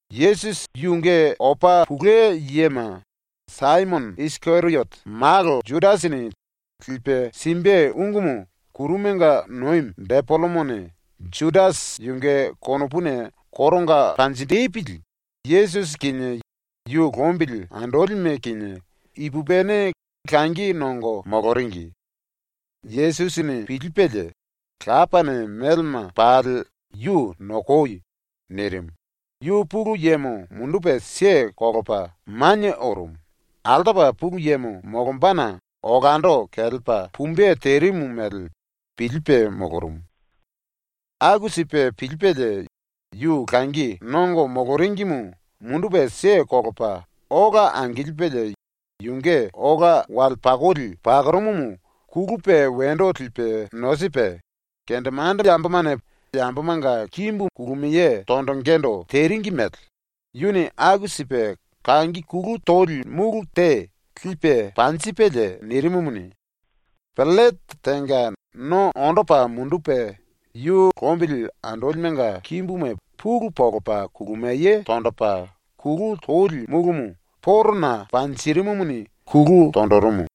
Yesusi yunge opa tou yema Saimono Isikeriote malo Judasini lipe simbe ungumu ⸤kurumanga nomi⸥ depelemone Judasi yunge konopuna koronga panjinjipili, Yesusi kinie yu lombili andolime kinie ipupini langi nongo moloringi. Yesusi pilipelie, Lapane melema pali yu “Nokoi.” nirimu, yu Pulu Yemo mundupe kelepa manie orumu, altopa Pulu Yemo molombana olando kelepa pumbe terimu mele pilipe molorumu. Aku sipe pilipelie, yu langi nongo moloringimu mundupe kelepa ola angilipelie yunge ola wale pakoli pakorumumu kulupe wendo lipe nosipe, kendemandemane yambomanga kimbu kulumiye tonjingindu teringi mele yuni aku sipe kangi kulu toli múlu te lipe panjipelie nirimumuni, pellete tenga no ondo lepa mundupe yu lombili andolimenga kimbuma pulu monjipe kulumiye tonjipe kulu toli múlumu porona panjirimumuni kulu tonjirimu.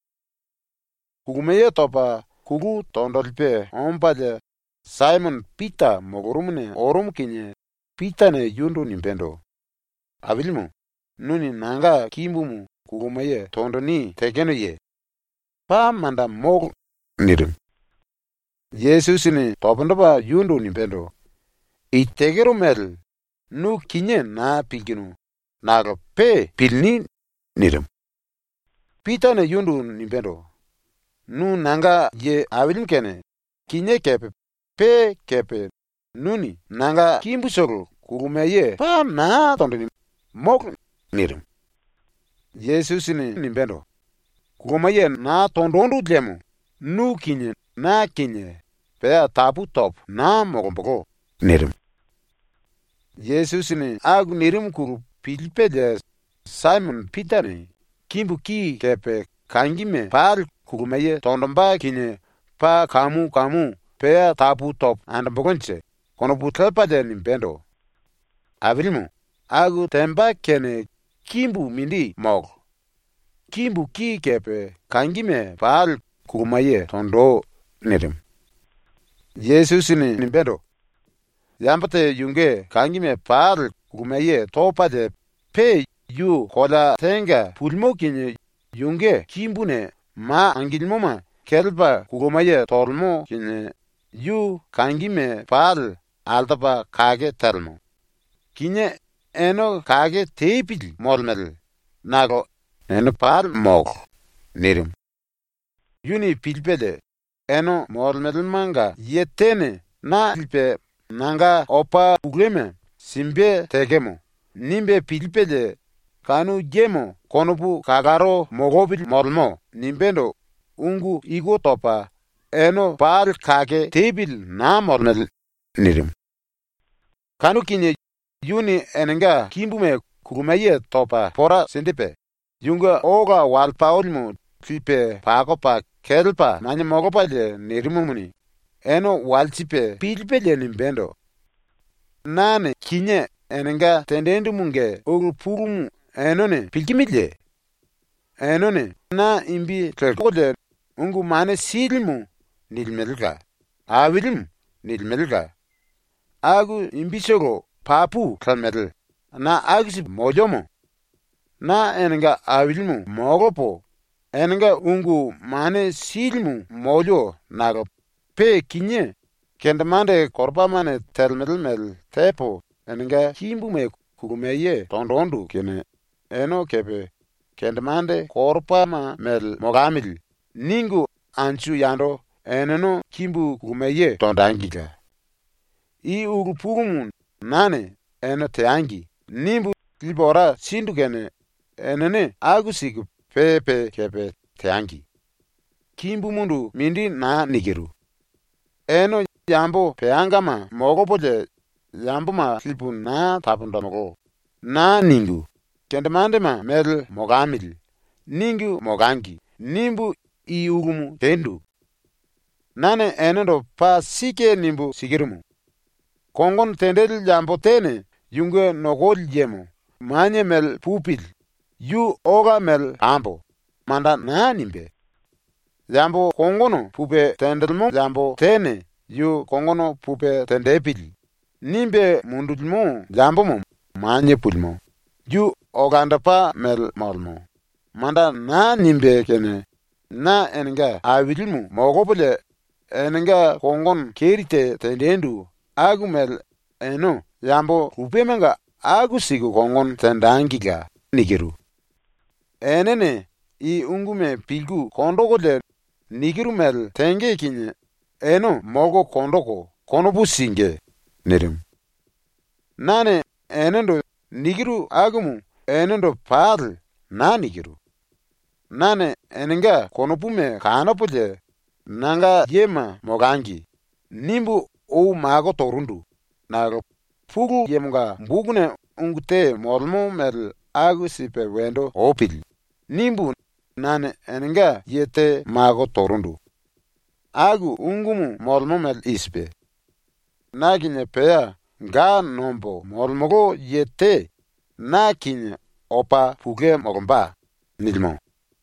Kulumiye topa kulu tonjilipe ombalie Saimono Pita molorumuna orumu kinie Pitane yundu nimbendo: “Ailimu, nuni nanga kimbumu kulumiye tonjini tekenoye? Paa manda molo!” nirimu. Yesusini pundu topa yundu nimbendo: “I tekero mele nu kinié naa pilkinu nakolo pe pilini.” nirimu. Pitane yundu nimbendo: “Nu nanga ye ailimu kene kinié kepe pe kepe nuni nanga kimbutolo kulumiye paa naa tonjini, molo.” nirimu. Yesusini nimbendo: “Kulumiye naa tonjindu liemo nu kinie na kinie pea tapu topo naa molombolo.” nirimu. Yesusini aku nirimuna pilipelie Saimono Pitane ⸤‘Kimbu ki kepe kangime pali kulumiye tonjimbe kinie paa kamu kamu pea tapu topo andombolonje.’ konopu lepalie⸥ nimbendo: “Ailimu, aku temba kene kimbu mindi molo! Kimbu ki kepe kangime pali kulumiye tonji!” nirimu. Yesusini nimbendo: “Yambo te yunge kangime pali kulumiye topalie pe yu kolea tenga pulimo kinie yunge kimbuna ma angilimoma kelepa kulumiye tolemo kinie yu kangime pali altopa kake telemo. Kinié ene kake tepili molemele, nakolo ene pali molo.” nirimu. Yuni pilipelie ‘Ene molemelemanga ye tene na lipe nanga opa touma simbe tekemo.’ nimbe pilipelie ‘Kanu yemo konopu kalaro molopili molemo.’ nimbendo ungu iku topa “Ene pali kake tepili naa molemele.” nirimu. Kanu kinie yuni enenga kimbuma kulumiye topa pora sinjipe, yunge ola wale pakolimu lipe pakopa kelepa manie molopalie nirimumuni, ene walsipe pilipelie nimbendo: “Nane kinié enenga tenjindumunge ulu pulumu enene pilkimiliye? Enene na imbi lelkolie “Ungu Mane Silimu” nilimelela, “Ailimu” nilimelela. Aku imbitolo papu lemele, na aku sipu moliomo. Na enenga Ailimu molopo enenga Ungu Mane Silimu molio nakolo pe kinié kendemande koropamane telemele mele tepo enenga kimbuma kulumiye tonjindu kene ene kepe ‘Kendemande koropama mele molamili.’ ningu anju yando eneno kimbu kulumiye tonjengila. I ulu pulumu nane ‘Ene teangi.’ nimbu lipu ora sindu kene enene aku siku pe pe kepe teangi. ⸤Kimbumundu mindi naa nikiru. ‘Ene ‘Yambo peangama molopolie yamboma lipu naa taponjimulú.’ naa ningu, ‘Kendemandema mele molamili.’ ningu molangi.’ nimbu i ulumu tendu.⸥ “Nane enendo paa sike nimbu sikirumu: Kongono tenjili yambo tene yunge nokoli yemo ‘Manie mele pupili.’ yu ‘Ola mele pambo.’ manda naa nimbé. Yambo kongono pupe tenjilimo yambo tene ‘Yu kongono pupe tenjipili.’ nimbe mundulimo yambomo ‘Manie pulimo.’ yu ‘Olandopa mele molemo.’ manda naa nimbé kene na enenga ailimu molopolie enenga kongono keri te tenjindu aku mele ene yambo lupemanga aku siku kongono tenjengila. Enene i unguma pilku konjikulie nikiru mele tenge kinie ene molko konjiku konopu singí.” nirimu. “Nane “enendo” nikiru akumu enendo pali naa nikiru. Nane enenga konopuma kanopolie ‘Nanga yema molangi.’ nimbu ou mako torundu, nakolo ‘Pulu Yemonga bokuna ungu te molemo mele aku sipe wendo opili.’ nimbu nane enenga ye te mako torundu. Aku ungumu molemo mele i sipe: “Na kinie pea ga nombo molemolo ye te na kinie opa tou molomba.” nilimo.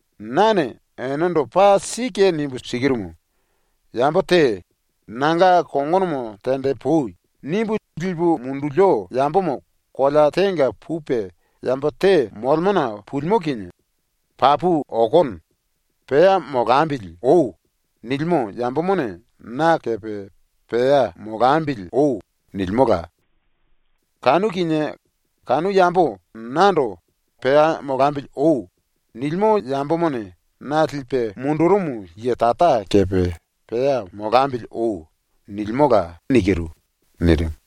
Nane enendo paa sike nimbu sikirumu: Yambo te “Nanga kongono tenjipui.” nimbu lipu mundulio yambomo kolea tenga pupe yambo te molemona pulimo kinie ‘Papu okono. Pea molambili oi.’ nilimo yambomone na kepe ‘Pea molambili oi.’ nilimola. Kanu kinie kanu yambo nando “Pea molambili oi.” nilimo yambomone na lipe mundurumu ye Tara kepe “Pea molambili oi.” nilimola.” nirimu.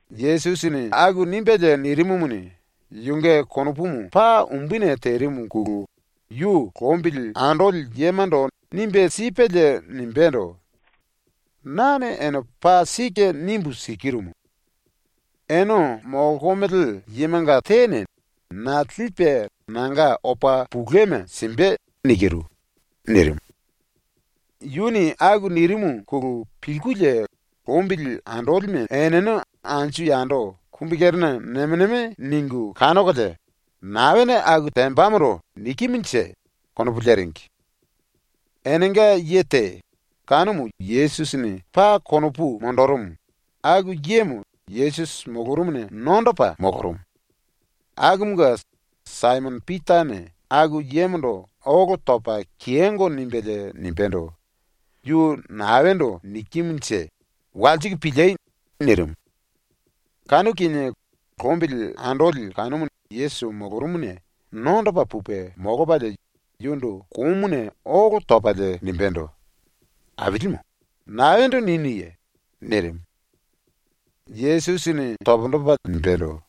Yesusini aku nimbelie nirimumuni, yunge konopumu paa umbuni terimuna yu lombili andoli yemando nimbe sipelie nimbendo: “Nane ene paa sike nimbu sikirumu: Ene molkomele yemanga tene na lipe nanga opa touma simbe.” nirimu. Yuni aku nirimuna pilkulie lombili andolime eneno anju yando kumbikerena nemo nemo ningu kanokolie ‘Naene aku tembamondo nikimunje?’ konopu leringi. Enenga ye te, kanumu Yesusini paa konopu monjirimu, aku yemo Yesusi molorumuna nondopa molorumu. Akumunge Saimono Pitane aku yemondo olo topa kiyongo nimbelie nimbendo: “Yu naendo nikimunje? Walsiku pili.” nirimu. Kanu kinie lombili andoli kanumu Yesusi molorumuna nondopa pupe molopalie yundu komuna olo topalie nimbendo: “Ailimu, naendo ninuye?” nirimu. Yesusini pundu topa nimbendo: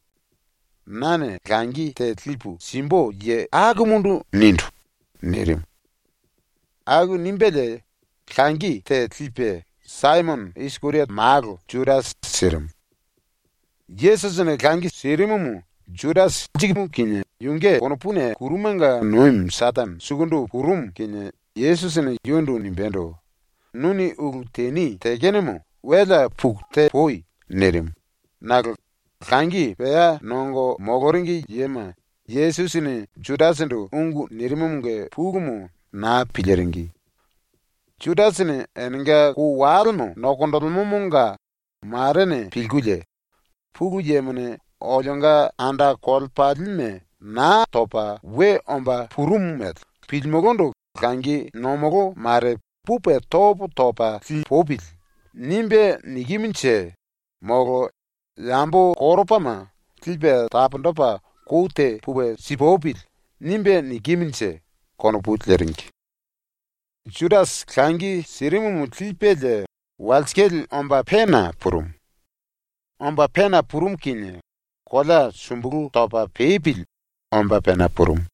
“Nane langi te lipu simbu ye akumundu nindu.” nirimu. Aku nimbelie langi te lipe Saimono Isikeriote malo Judasi sirimu. Yesusini langi sirimumu Judasi lirimu kinie yunge konopuna ⸤kurumanga nomi⸥ Setene sukundu purumu kinie Yesusini yundu nimbendo: “Nuni ulu teni tekenomo welea puku tepui.” nirimu, nakolo langi pea nongo moloringi yema Yesusini Judasindu ungu nirimumunge pulumu naa piliringi. Judasini enenga kou walemo nokonjilimomonga marene pilkulie, ‘ ‘Pulu Yemone olionga anda kolepalime Naa Topa We Omba Purumu mele pilimulundu langi nomolo mare pupe topo topa lipupili.’ nimbe nikimunje molo ‘Yambo koropama lipe taponjipe kou te pupe sipupili.’ nimbe nikimunje.’ konopu leringi. Judasi langi sirimumu lipelie walsikale omba pena purumu. Omba pena purumu kinie kolea sumbulu topa pepili omba pena purumu.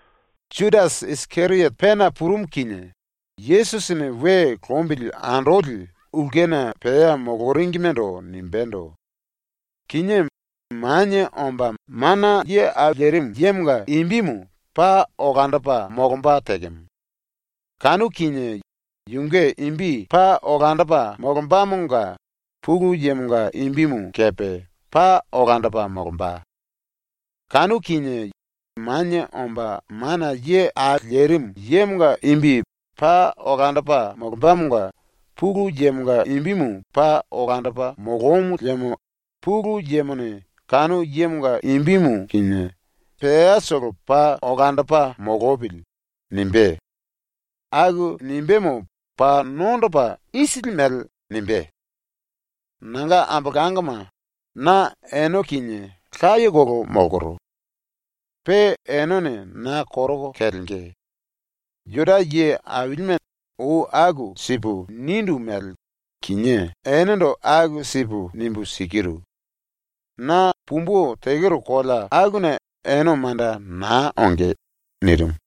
Judasi Isikeriote pena purumu kinie Yesusini we lombili andoli ulkena pea moloringimendo nimbendo: “Kinié Manie Omba Mana Ye Au Lerimu Yemonga imbimu paa olandopa molomba tekemo. Kanu kinie yunge imbi paa olandopa molombamonga Pulu Yemonga imbimu kepe paa olandopa molomba. Kanu kinie Manie Omba Mana Ye Au Lerimu Yemonga imbi paa olandopa molombamonga Pulu Yemonga imbimu paa olandopa molomu liemo Pulu Yemone kanu yemonga imbimu kinie ‘peatolo paa olandopa molopili.’ nimbé. Aku nimbémo paa nondopa isili mele nimbé. “Nanga ambolangoma, na ene kinie layekolo molkoro. Pe enene na koroko kelenge. Juda ye ailime ou aku sipu nindu mele kinié enendo aku sipu nimbu sikiru. Na pumbu tekero kolea akuna ene manda naa onge.” ⸤nirimu.⸥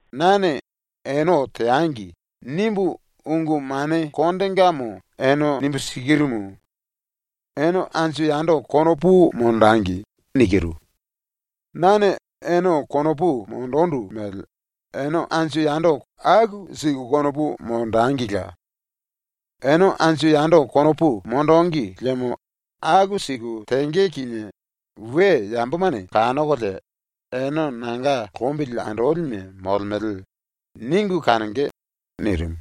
“Nane ‘ene teangi.’ nimbu ungu mane kondengamo ene nimbu sikirumu: Ene anju yando konopu monjengi. Nane ene konopu monjindu mele ene anju yando aku siku konopu monjengila. Ene anju yando konopu monjíngi liemo aku siku tenge kinie we yambomane kanokolie ‘Ene nanga lombili andolime molemele.’ ningu kanonge.” nirimu.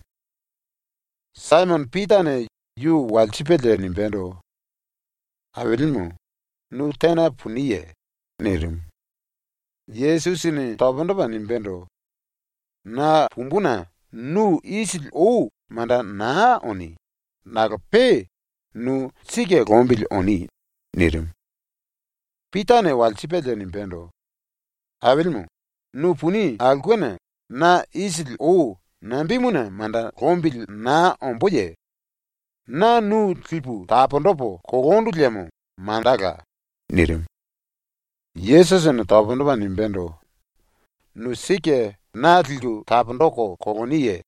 Saimono Pitane yu walsipelie nimbendo: “Ailimu, nu tena puniye?” nirimu. Yesusini pundu topa nimbendo: “Na pumbuna nu isili ou manda naa oni. Nakolo pe nu sike lombili oni.” nirimu. Pitane walsipelie nimbendo: “Ailimu, nu puni aulkena na isili ou nambemuna manda lombili naa omboye? Na nu lipu taponjipu kolondu liemo mandala.” nirimu. Yesusini pundu topa nimbendo: “Nu sike na liku taponjiku koloniye?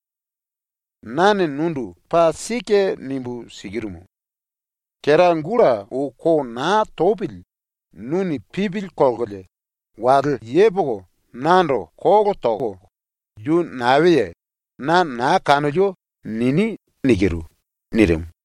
Nane nundu paa sike nimbu sikirumu: Kera gulta ou ko naa topili nuni ⸤pipili kolkolie⸥ wale yepoko nando kolo toko “Yu naeye? Na naa kanolio.” nini.” nirimu.